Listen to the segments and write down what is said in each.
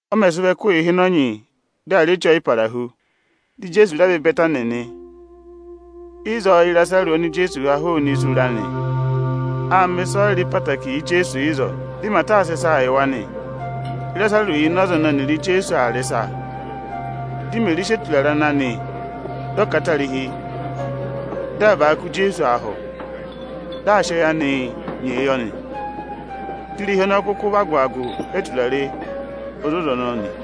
Ọ mẹ̀ sị vọ ẹkụhị ịhịnọnyị dị à rị Eche Ọyịparahu, dị Ijeesu rẹ vẹ Ịbẹtanị nị. Ịzọọ Ị́rasarụsị oni Ijeesu ha hụụnị isu ra nị. Â mẹ ịsọyịrị ẹtẹẹtẹrẹ yị Ijeesu ịzọọ; dị Ịmata ộ sị ịsa yị wa nị. Ịrasarụsị yà ịnị ọza ẹnẹ ẹnịrị Ijeesu rị ịsa. Dị Imeri sị eturare obooro ijonggo ọbanyị ọnya ana katarihi, dị aa ka a hi Ijeesu ahụ, dị aa sị ẹyị anịị nyee yọ nị. Dị irehi ọnọọ kụkụ vị agụ-agụ eturare ozoza ọnọọ nị.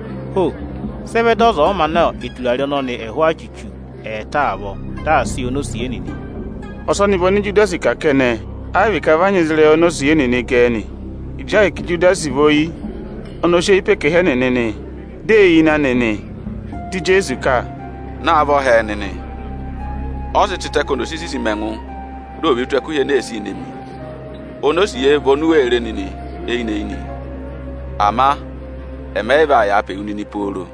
“Ho! Sị ẹ vẹ dị ọza ọ̀ọ mā ná eturare ọnọnị ẹhụụ achuchu ẹẹta avọọ, dị à sị yị onosiye nịnị?” Ọsọnị vị ọnị Ijudasi kà kẹnẹ, ẹ yị vị ka vị a nyị ịzị ịrẹyị onosiye nịnị gẹ ẹ nị. Ịjị ahịka Ijudasi vị oyi, ọnị ọ sị eyi pe ẹkẹhị ẹnịnị nị, di ee yi ịnị anị nị. Dị Ijeesu ka, “Naavọ hẹẹ nịnị, vị ọ sị eturare ọnọnị tịtẹ ka ọnị ọ̀ sị sisi mi ẹngụ, di ò ve tù ẹkụhị ene ee sii ne mi nị. Onosiye vị oni u wee re nịnị eyinị-eyinị; ama ẹmị ẹ yị vaa yàa pe wu nịnị pooro.”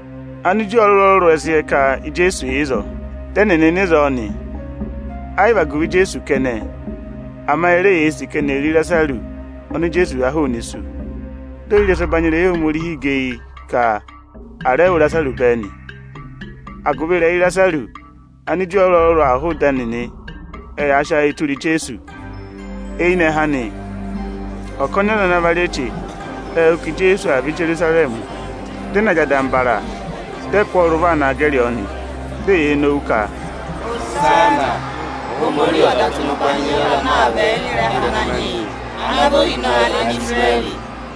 Aniju ọrụrụ-ọrụrụ ẹ sị yẹ ka Ijeesu yà ịzọọ. Dị ẹnịnị nọ ịzọọ nị, ẹ yị vị agụvị Ijeesu kẹnẹ, ama e re yee sì ka eni è re Ịrasarụsị oni Ijeesu ha hụụnị isu. Dị ohirẹsụ ẹbanyị irehi Ohomorihi gẹ eyi ka a rẹ wụ Ịrasarụsị bẹẹ nị. Agụvị ịrẹyị Ịrasarụsị, Aniju ọrụrụ-ọrụrụ aa hụụ ịdị ẹnịnị, ẹ yaa sị ayịị tụra Ijeesu. Eyinẹhẹ anị, ọkọnị aza ana va rị eche, ệ wụ́ ka Ijeesu aa vẹ Ijerusarẹmị. Dị ẹ na jị adambara, dị ẹ kụ́ ọ rị ụvọ aa naa gẹrị ọọ nị. Di eyee nowu ka, “Ihosana! Ohomorihi ọ̀ dà tụ́ ịnị ụbanyị yị ọza ana aa vẹ ịnị ịrẹha Ananyị yị, ana vị Ohinọyị Anisirẹrị.”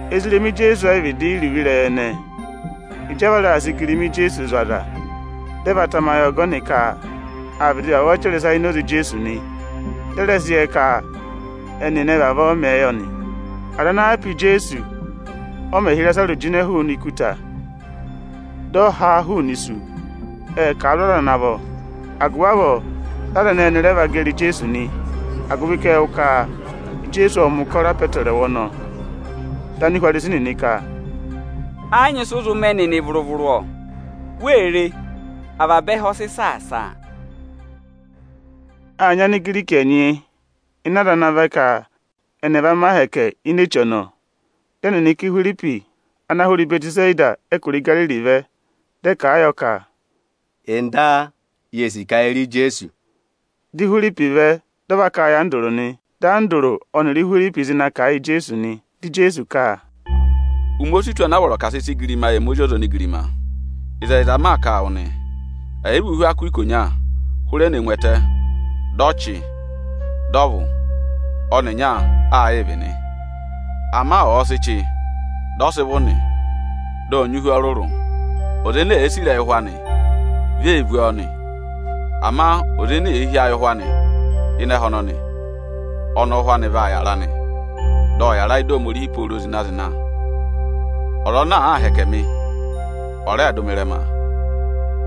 Ezirẹma Ijeesu ẹ yị vịdị yẹ iruvo ịrẹyị ẹnẹẹ. Ịjị a va raà sị igirima Ijeesu zụ̀ aza, dị ẹ va tamayị ọgọnị ka â vịdị vavọọ chẹrẹ ịsa ini oze Ijeesu nị; dị ẹ rẹ sị yẹ ka ọnị ẹnị vavọọ mẹẹ yọ nị. Aza ana yà pe Ijeesu, ọ mẹ̀ hị́ Ịrasarụsị jịnẹ hụụnị ikuta dị ọ ha a hụụnị isu, ệ kà a zụ̀ aza ana vọ. Agụvị avọọ, dị aza ẹnẹẹ ẹnị rẹ vẹ va gẹrị Ijeesu nị, agụvị ka ệ wụ́ ka Ijeesu ộ mẹ̀ ụkọrọ apọtẹrẹwa ọnọnị. Dị Anihwarisi nịnị ka, “Ẹ yị nyị ịsị ụ zụ mẹ nịnị vụrụ-vụrụ, o. Wee re, avaba ẹhẹ ọ sị saasa a!” Â nyị Anigiriki ẹnyị ịnị aza ana vẹ ka ẹnị ẹ̀ va mẹ ahẹkẹ ini eche ọnọọ. Dị ẹnịnị ka Ihwiripi ana hụrẹ Ịbẹtịseda ẹkụra Igariri vẹ, dị ẹ kà a yọ ka, “Ọga, yee sì ka ye re Ijeesu.” Di Ihwiripi vẹ, dị ọ va kà a yị Andụrụ nị. Dị Andụrụ ọnịrị Ihwiripi zị na kà a yị Ijeesu nị. Dị Ijeesu ka, “Ụmẹ o si tù ana a vọrọ ka à sị sị igirima yị ẹmị Ozi ọza onigirima. Ịzẹyịza m maa kà a wụ nị, ẹ̀ yị vị a sị ihu akụ ikonya chire ẹtẹ, dị ọ vụ̀, dị ọ chị, ọnịnya aa yịị vị nị. Ama ọ̀ọ sị vụ̀, dị ọ sị chị nị, dị ọ vaa nyị ihu ọrụrụ. Ọza ene èe sì ịrẹyị ụhwẹ anị, vi ee vú ọọ nị; ama ọza ene èe hí ayị ụhwẹ anị ịnị ẹhẹ ọnọnị, ọnị ụ́hwẹ anị vaa yàra nị, dị ọ yàra ịdị Ohomorihi pooro zịna-zịna. Ọza ana àaa hẹkẹ mị, ọ̀ rẹẹ dụ mị ịrẹma!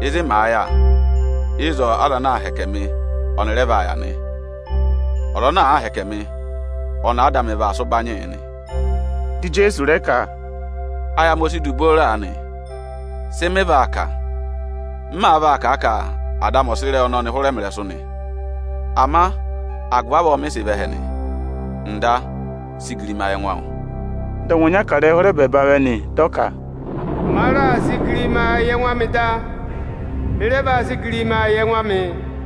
Ịzị màa yà, ịzọọ aza ana aa hẹkẹ mị ọnị rẹ vaa yà nị. Ọza ana àaa hẹkẹ mị, ọnị Áda amị vaa sị ụbanyị yị nị.” Dị Ijeesu rẹ ka, “Ayị amị o si du booro aanị. Sị mị vaa kà? M máá vaa kà a ka Ada amị ọ̀ sị ịrẹyị ọnọnị hụrẹ mị ịrẹsụ nị? Ama agụvị avọọ mị sị vẹ ẹhẹ nị. Ọga, sị igirima yị ẹngụ awụ!” Dị ọngwẹ ọnya kà ịrẹyị hụrẹ ẹbẹẹba vẹ nị, dị ọ ka, “Ma raà sị igirima yị ẹngụ amị da, mị rẹ vaa sị igirimaa yị ẹngụ amị.”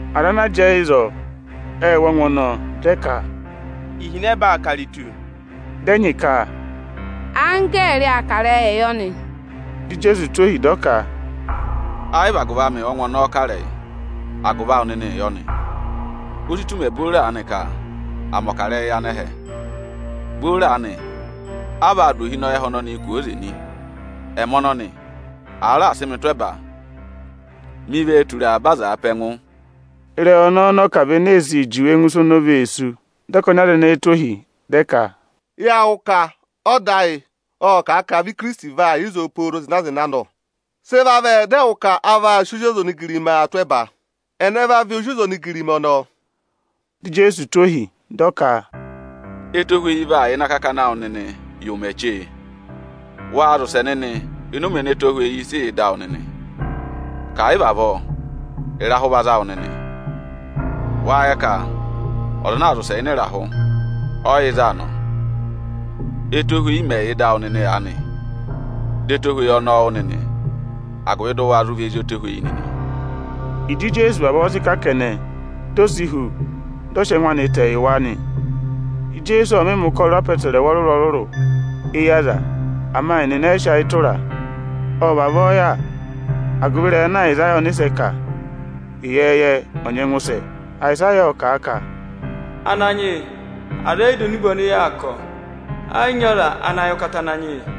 Aza ana jẹẹ ịzọọ ệ wụ́ ọngwẹ ọnọọ, dị ẹ ka, “Ihinẹba aa kà iritu.” Dị ẹnyị ka, “Anggẹẹrị aa kà ịrẹyịị yọ nị.” Dị Ijeesu tụ́ ohi, dị ọ ka, “Ẹ yị vị agụvị amị ọ́ngwẹ ọnọọ kà ịrẹyị, agụvị awụ nịnịị yọ nị. O si tù ụmẹ booro aanị ka à mẹ̀ ọkarẹyị yị anẹhẹ. Booro aanị a vaa dụ ohinọyị ẹhẹ ọnọnịị jịnẹẹ kwooze nị. Ẹmị ọnọnị, àa raà sị mị tụ́ ẹba, mi vee tura avaba azaa pe ẹngụ.” Ịrẹyị ọnọọ ọnị ọ kà vị ene ee sii juwe ẹngụ isu oni o vee sú. Dị ọkọnị aza ẹnẹẹ tụ́ ohi, dị ẹ ka, “Yâ wụ́ ka ọda ayị ộ kà a ka vị Ikirisiti vaa yà ịzọọ pooro zịna-zịna nọ! Sị ẹ vavẹ dị ẹwụ ka a vaa sị Ozi ọza onigirimaa tụ́ ẹba? Ẹnẹ va vị Ozi ọza onigirima ọnọọ?” Dị Ijeesu tụ́ ohi, dị ọ ka, “Etohweyi vaa yà ịnị akakana awụ nịnị yị ụmẹ chee. Waa zị ụsẹ nịnị ịnị ụmẹ ene ẹtohweyi sị yà ịdị awụ nịnị, ka ẹ̀ yị vị avọọ, ịrahụ va za wụ nịnị. Wâ yẹ ka ọza ana aa zị ụsẹ ịnị ịrahụ, ọ yị yẹ ịzị aa nọ. Etohweyi mẹ̀ yị yà ịdị awụ nịnị aanị, dọ ẹtohweyi ọnọọ wụ́ nịnị, agụvị dị ụ wa zụ vị ezi ẹtohweyi nịnị!” Aniju nịnị ẹ yị yị dọ wụ́ Ịjị Ijeesu vavọọ sị kà kẹnẹ, di o si hu, dị ọ sị ẹngụ anị tẹ yị wa nị. Ijeesu ộ mị mẹ̀ ụkọrọ apọtẹrẹwa ọrụrụ-ọrụrụ éyi aza, ama ẹnịnị ẹ yị sị ayị tụra a. Ọ vavọọ yà, agụvị ịrẹyị ana Ayịsaya ọnịsẹ kà ịyẹẹyẹ ọ̀ nyẹngụ sẹ. Ayịsaya ộ kà a ka, “Ananyị yị, aza ẹ yị dọ enube ọnị yaa kà, ọ. Ẹ yị nyị ọza ana yẹ ụkata Ananyị yị.”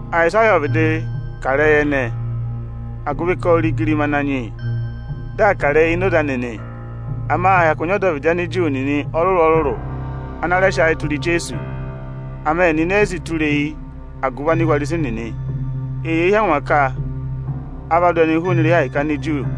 Ayịsaya ộ vịdị kà ịrẹyị ẹnẹẹ, agụvị ka ô re igirima Ananyị yị, dị aa kà ịrẹyị ini oze anị nị. Ama â hyakụ nyị ọdọvịdị Aniju nịnị ọrụrụ-ọrụrụ ana rẹ sị ayị tụra Ijeesu. Ama ẹnịnị ẹ yị sị tụra eyi agụvị Anihwarisi nịnị. Eyee hí angwa ka a va dụ ẹnị hụụnị irehi Ohomorihi Aniju nịnị.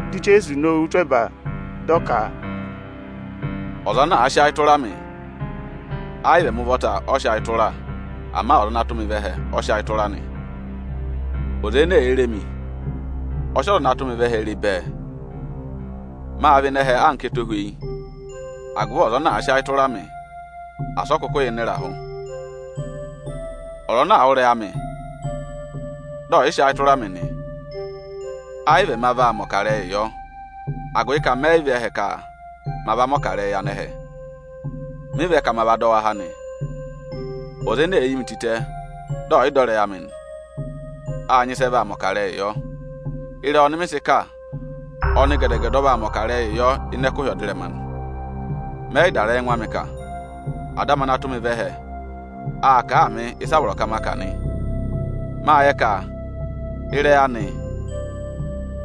Dị Ijeesu nowu tụ́ ẹba, dị ọ ka, “Ọza ana àa sị ayị tụra mị, ẹ yị vị ẹmị ụvọta ọ sị ayị tụra, ama Ọza ana tụ́ mị vẹ ẹhẹ, ọ sị ayị tụra nị. Ọza ene èe re mi, ọ sị Ọza ana tụ́ mị vẹ ẹhẹ re bẹẹ. Mâ vẹ ịnị ẹhẹ anka ẹtohweyi, agụvị ọza ana àa sị ayị tụra mị, asị ọ kụkụ yị yà ịnị ịrahụ. Ọza ana àa wụ́ ịrẹyị amị, dị ọ̀ yị sị ayị tụra mị nị, ẹ yị vị ẹma vaa mẹ̀ ọkarẹyị yọ, agụvị ka mẹ yị vẹ ẹhẹ ka ma va mẹ̀ ọkarẹyị yị anẹhẹ; mị vẹ ka ma va dọ wa há nị. Ọza ene èe yi mi tịtẹ, dị ọ̀ yị dọ ịrẹyị amị nị, â nyị ịsị ẹ vaa mẹ̀ ọkarẹyị yọ. Ịrẹyị ọnị mị sị kà, ọnị gẹdẹ-gẹdẹ ọ vaa mẹ̀ ọkarẹyị yọ ịnị ẹkụhị ọdịrẹma nị. Mẹ yị dà ịrẹyị ẹngụ amị kà, Ada amị ana tụ́ mị vẹ ẹhẹ aa kà a mị ịsa a vọrọ ka ma kà nị. Mâ yẹ ka ịrẹyị anị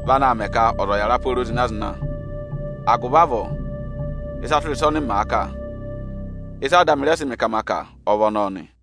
vị anaā mẹ ka ọza ọ̀ yàra pooro zịna-zịna. Agụvị avọọ, ịsa tụra ịsa ọnị màa kà, ịsị Ada amị rẹ sị mị ka ma kà ọ vị ọnọọ nị.”